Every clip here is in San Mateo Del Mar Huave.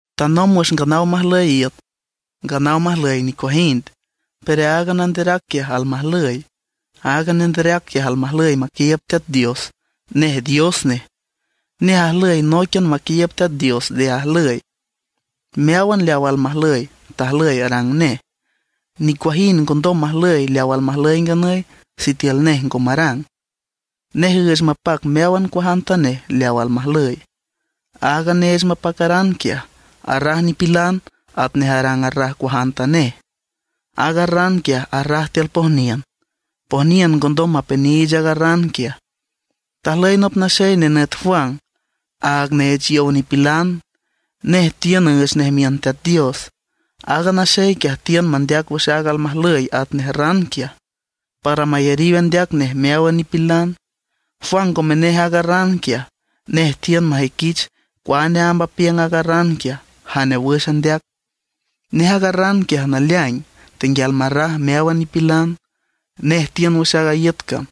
Tanomb wüx nganaw majlüy iüt, nganaw majlüy nicuajind, pero aaga Nanderac quiaj almajlüy. Aaga Nanderac quiaj almajlüy maquiiüb Teat Dios; nej Dios nej. Nej ajlüy nóiquian maquiiüb Teat Dios nde ajlüy. Meáwan leaw almajlüy, tajlüy arang nej. Nicuajind ngondom majlüy leawa almajlüy nganüy, sitiül nej ngo marang. Nej üüch mapac meáwan cuajantanej leaw almajlüy. Aaga neech mapacaran quiaj, arraj nipilan atnej ran arraj cuajantanej. Aaga ran quiaj arraj tiül pojniün; pojniün ngondom mapeniich aaga ran quiaj. Tajlüy nop naxey nenüt Juan, aaga neech yow nipilan; nej tiün üüch nej miün Teat Dios. Aaga naxey quiaj tiün mandeac wüx aaga almajlüy atnej ran quiaj, para mayariw andeac nej meáwan nipilan. Juan ngome nej aaga ran quiaj. Nej tiün majüiquich cuane amb apiüng aaga ran quiaj, jane wüx andeac. Nej aaga ran quiaj naleaing, tenguial marraj meáwan nipilan; nej tiün wüx aaga iüt cam.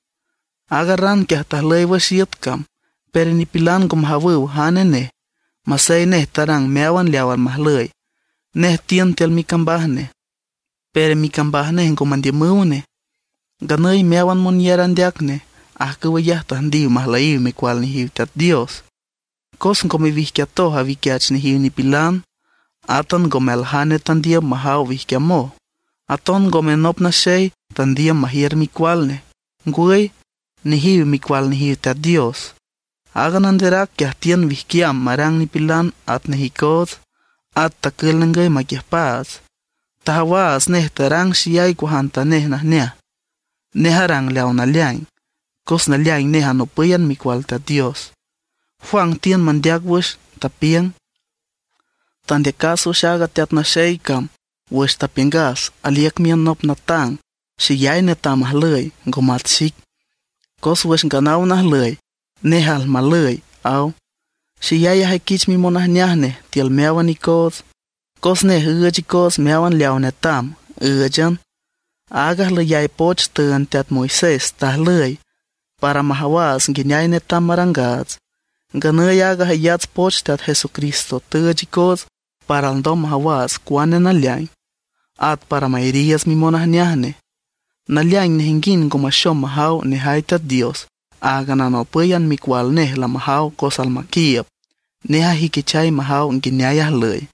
Aaga ran quiaj tajlüy wüx iüt cam, pero nipilan ngo majawüw jane nej masey nej tarang meáwan leaw almajlüy. Nej tiün tiül micambaj nej; pero micambaj nej ngo mandiümüw nej. Nganüy meáwan monyar andeac nej, ajcüw ayaj tüjndiw majlüyiw micual nejiw Teat Dios. Cos ngome wijquiatoj awiquiach nejiw nipilan, átan ngome aljane tandiüm majaw wijquiamoj. Aton ngome nop naxey tandiüm majiür micual nej. Ngwüy, nejiw micual nejiw Teat Dios. Aaga Nanderac quiaj tiün wijquiam marang nipilan atnej icoots; at tacül ningüy maquiüjpaats. Tajawaats nej tarang xeyay cuajantanej najneaj. Nej arang leaw naleaing, cos naleaing nej anopǘyan micual Teat Dios. Juan tiün mandeac wüx nej, tapiüng: ―Tandeacas wüx aaga Teat Naxey cam wüx tapiüngas aliüc miün nop natang, xeyay netam ajlüy, ngo mat xic; cos wüx nganaw najlüy, nej almajlüy ―aw. Xeyay ajüiquich mimonajneaj nej tiül meáwan icoots, cos nej üüch icoots meáwan leaw netam, ǘüchan. Aaga ajlüyay poch tüünd teat Moisés tajlüy, para ndom majawaats nguineay netam marangaats. Nganüy aaga jayats poch Teat Jesucristo tüüch icoots para alndom majawaats cuane naleaing, at para mayariiüts mimonajneaj nej. Naleaing nejinguind ngo maxom majaw nejay Teat Dios. Áagan anopǘyan micual nej lamajaw cos almaquiiüb, nej ajüiquichay majaw nguineay ajlüy.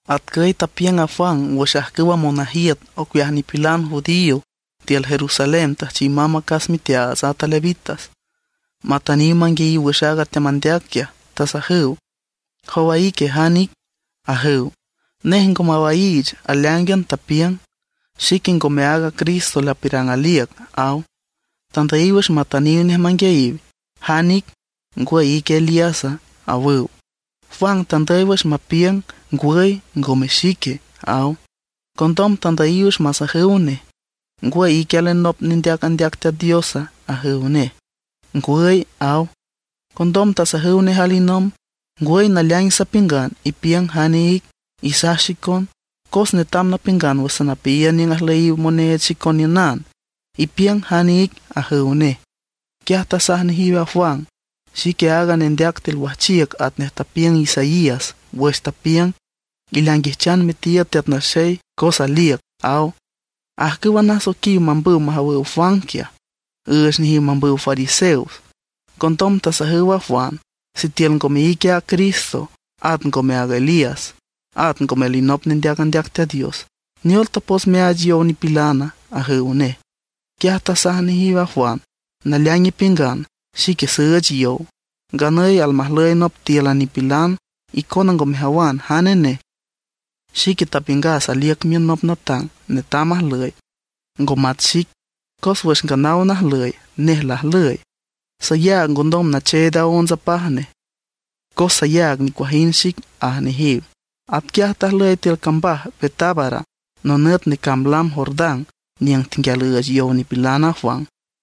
Atcüy tapiüng a Juan wüx ajcüwa monajiüt ocueaj nipilan judío tiül Jerusalén tüjchiw mamb acas miteaats ata levitas, matüniw manguiayiw wüx aaga teamandeac quiaj. Tasajüw: ―¿Jowa ique jan ic? ―ajüw. Nej ngo mawaiich, aleáingan tapiüng: ―Xique ngome aaga Cristo lapiürang aliüc ―aw. Tandüyiw wüx matüniw nej manguiayiw: ―¿Jane ic? ¿Ngwüy ique Elíasa? ―awüw. Juan tandüy wüx mapiüng: ―Ngwüy, ngome xique ―aw. Condom tandüyiw wüx masajüw nej: ―¿Ngwüy ique alinop nendeac andeac Teat Diosa? ―ajüw nej. ―Ngwüy ―aw. Condom tasajüw nej alinomb: ―Ngwüy naleaing sapiüngan, ipiüng jane ic, isaj xicon. Cos netam napiüngan wüx sanapeayiün niüng ajlüyiw moneech xicon niünan. Ipiüng jan ic ―ajüw nej. Quiaj tasaj nejiw a Juan: ―Xique aaga nendeac tiül wajchiüc atnej tapiüng Isaías wüx tapiüng: “Ileainguijchan mitiiüd Teat Naxey cos aliüc” ―aw. Ajcüwa nasoiquiw mambüw majawüw a Juan quiaj, üüch nejiw mambüw fariseos. Condom tasajüw a Juan: ―Sitiül ngome ique a Cristo, at ngome aaga Elías, at ngome alinop nendeac andeac Teat Dios, ¿neol tapots meaach yow nipilan? ―ajüw nej. Quiaj tasaj nejiw a Juan: ―Naleaing ipiüngan xique süüch yow. Nganüy almajlüy nop tíülan nipilan, icona ngo mejawan jane nej. Xique tapiüngas aliüc miün nop natang netam ajlüy, ngo mat xic, cos wüx nganaw najlüy, nej lajlüy. Sayaag ngondom nacheed aonts apaj nej, cos sayaag nicuajind xic ―aj nejiw. Atquiaj tajlüy tiül cambaj Betábara nonüt necamb lam Jordán niüng tenguial üüch yow nipilan a Juan.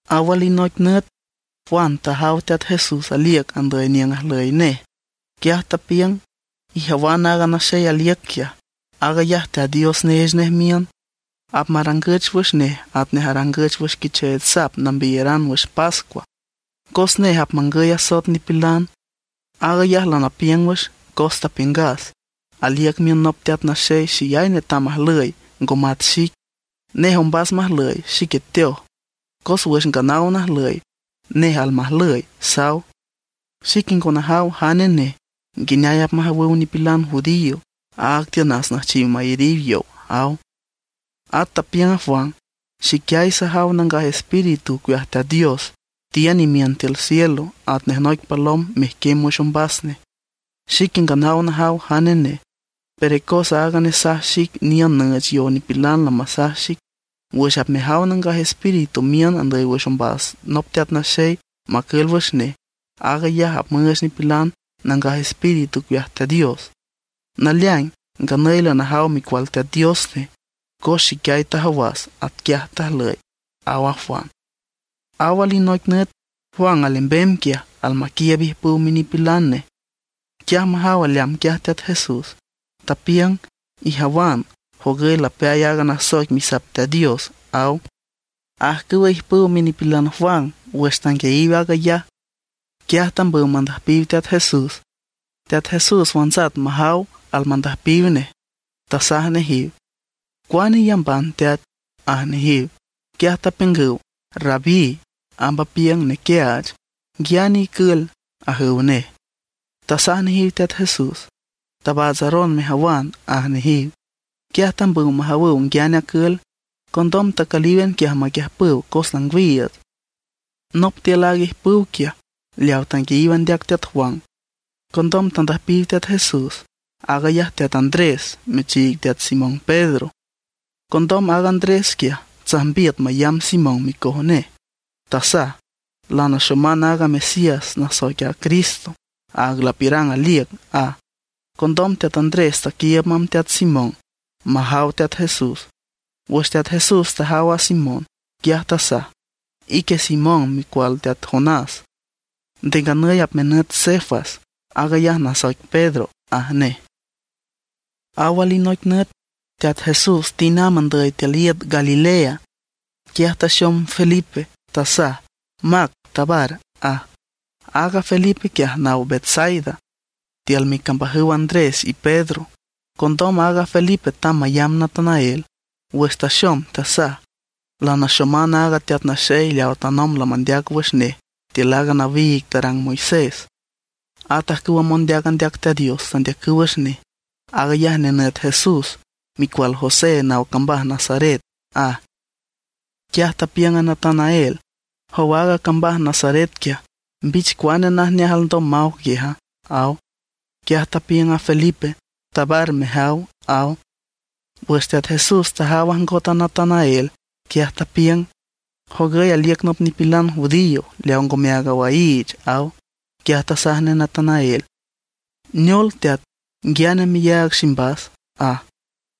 Aw alinoic nüt, Juan tajaw Teat Jesús aliüc andüy niüng ajlüy nej. Quiaj tapiüng: ―Ijawan aaga naxey aliüc quiaj. Aag ayaj Teat Dios neech nej miün. Apmarangüch wüx nej atnej arangüch wüx quicheech sap nambiyaran wüx pascua, cos nej apmangüy asoet nipilan. Aag ayaj lanapiüng wüx, cos tapiüngas: “Aliüc miün nop teat naxey xeyay netam ajlüy, ngo mat xic. Nej ombas majlüy, xique teoj; cos wüx nganaw najlüy, nej almajlüy”, saw. Xique ngo najaw jane nej, nguineay apmajawüw nipilan judío. Áag tiünas nüjchiw mayariw yow ―aw. At tapiüng a Juan: ―Xiquiay sajaw Nangaj Espíritu ocueaj Teat Dios tiün imiün cielo atnej noic palom mejquiem wüx ombas nej. Xique nganaw najaw jane nej. Pero cos aaga nesaj xic niün nüüch yow nipilan lamasaj xic: “Wüx apmejaw Nangaj Espíritu miün andüy wüx ombas nop teat naxey macül wüx nej, aag ayaj apmüüch nipilan Nangaj Espíritu ocueaj Teat Dios.” Naleaing, nganüy lanajaw Micual Teat Dios nej, cos xiquiay tajawas atquiaj tajlüy ―aw a Juan. Aw alinoic nüt Juan alembem quiaj almaquiiüb ijpüw minipilan nej. Quiaj majaw aleamb quiaj Teat Jesús, tapiüng: ―Ijawan, jogüy lapeay aaga nasoic Misap Teat Dios ―aw. Ajcüwa ijpüw minipilan Juan wüx tanguiayiw aag ayaj, quiaj tambüw mandüjpiw Teat Jesús. Teat Jesús wantsat majaw almandüjpiw nej, tasaj nejiw: ―¿Cuane iyamban, teat? ―aj nejiw. Quiaj tapiüngüw: ―Rabí (amb apiüng nequiaach), ¿nguiane icül? ―ajüw nej. Tasaj nejiw Teat Jesús: ―Tabaatsaron mejawan ―aj nejiw. Quiaj tambüw majawüw nguiane acül. Condom tacülíwan quiaj maquiüjpüw, cos langwiiüts. Nop tiül aaga ijpüw quiaj leaw tanguiayiw andeac teat Juan, condom tandüjpiw Teat Jesús, aag ayaj teat Andrés, michiig teat Simón Pedro. Condom aaga Andrés quiaj tsajmbiüt mayamb Simón micoj nej, tasaj: ―Lanaxoman aaga Mesías nasoic a Cristo, aag lapiürang aliüc ―aj. Condom teat Andrés taquiiüb mamb teat Simón majaw Teat Jesús. Wüx Teat Jesús tajaw a Simón, quiaj tasaj: ―Ique Simón micual teat Jonás, nde nganüy apmenüt Cefas, aag ayaj nasoic Pedro ―aj nej. Aw alinoic nüt Teat Jesús tind amb andüy tiül iüt Galilea, quiaj taxom Felipe, tasaj: ―Mac, tabar ―aj. Aaga Felipe quiaj naw Betsaida tiül micambajüw Andrés y Pedro. Condom aaga Felipe tamb mayamb Natanael. Wüx taxom tasaj: ―Lanaxoman aaga teat naxey leaw tanomb lamandeac wüx nej tiül aaga nawiig tarang Moisés. At ajcüwa mondeac andeac Teat Dios tandeacüw wüx nej. Aag ayaj nenüt Jesús, micual José, naw cambaj Nazaret ―aj. Quiaj tapiüng Natanael: ―Jow aaga cambaj Nazaret quiaj, ¿mbich cuane najneaj alndom maw quiaja? ―aw. Quiaj tapiüng a Felipe: ―Tabar mejaw ―aw. Wüx Teat Jesús tajaw ajngot a Natanael, quiaj tapiüng: ―Jogüy aliüc nop nipilan judío leaw ngome áag awaiich ―aw. Quiaj tasaj nej Natanael: ―¿Neol teat, nguiane meyaag ximbas? ―aj.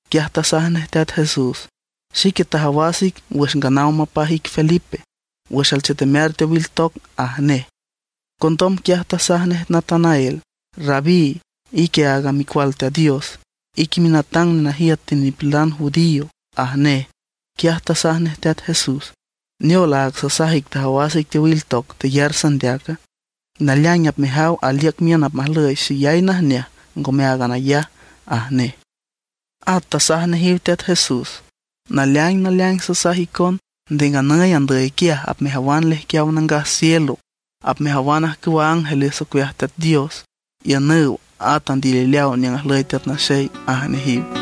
Quiaj tasaj nej Teat Jesús: ―Xique tajawas ic wüx nganaw mapaj ic Felipe, wüx alchetemear teowil toc ―aj nej. Condom quiaj tasaj nej Natanael: ―Rabí, ique aaga Micual Teat Dios, ique minatang nenajiüt tiül nipilan judío ―aj nej. Quiaj tasaj nej Teat Jesús: ―¿Neol, aag sasaj ic tajawas ic teowil toc teyar sandeaca? Naleaing apmejaw aliüc miün apmajlüy xeyay najneajneaj, ngome áagan ayaj ―aj nej. At tasaj nejiw Teat Jesús: ―Naleaing naleaing sasaj icon, nde nganüy andüy quiaj apmejawan lejquiaw nangaj cielo, apmejawan ajcüwa ángeles ocueaj Teat Dios iünüw at andilileaw niüng ajlüy Teat Naxey ―aj nejiw.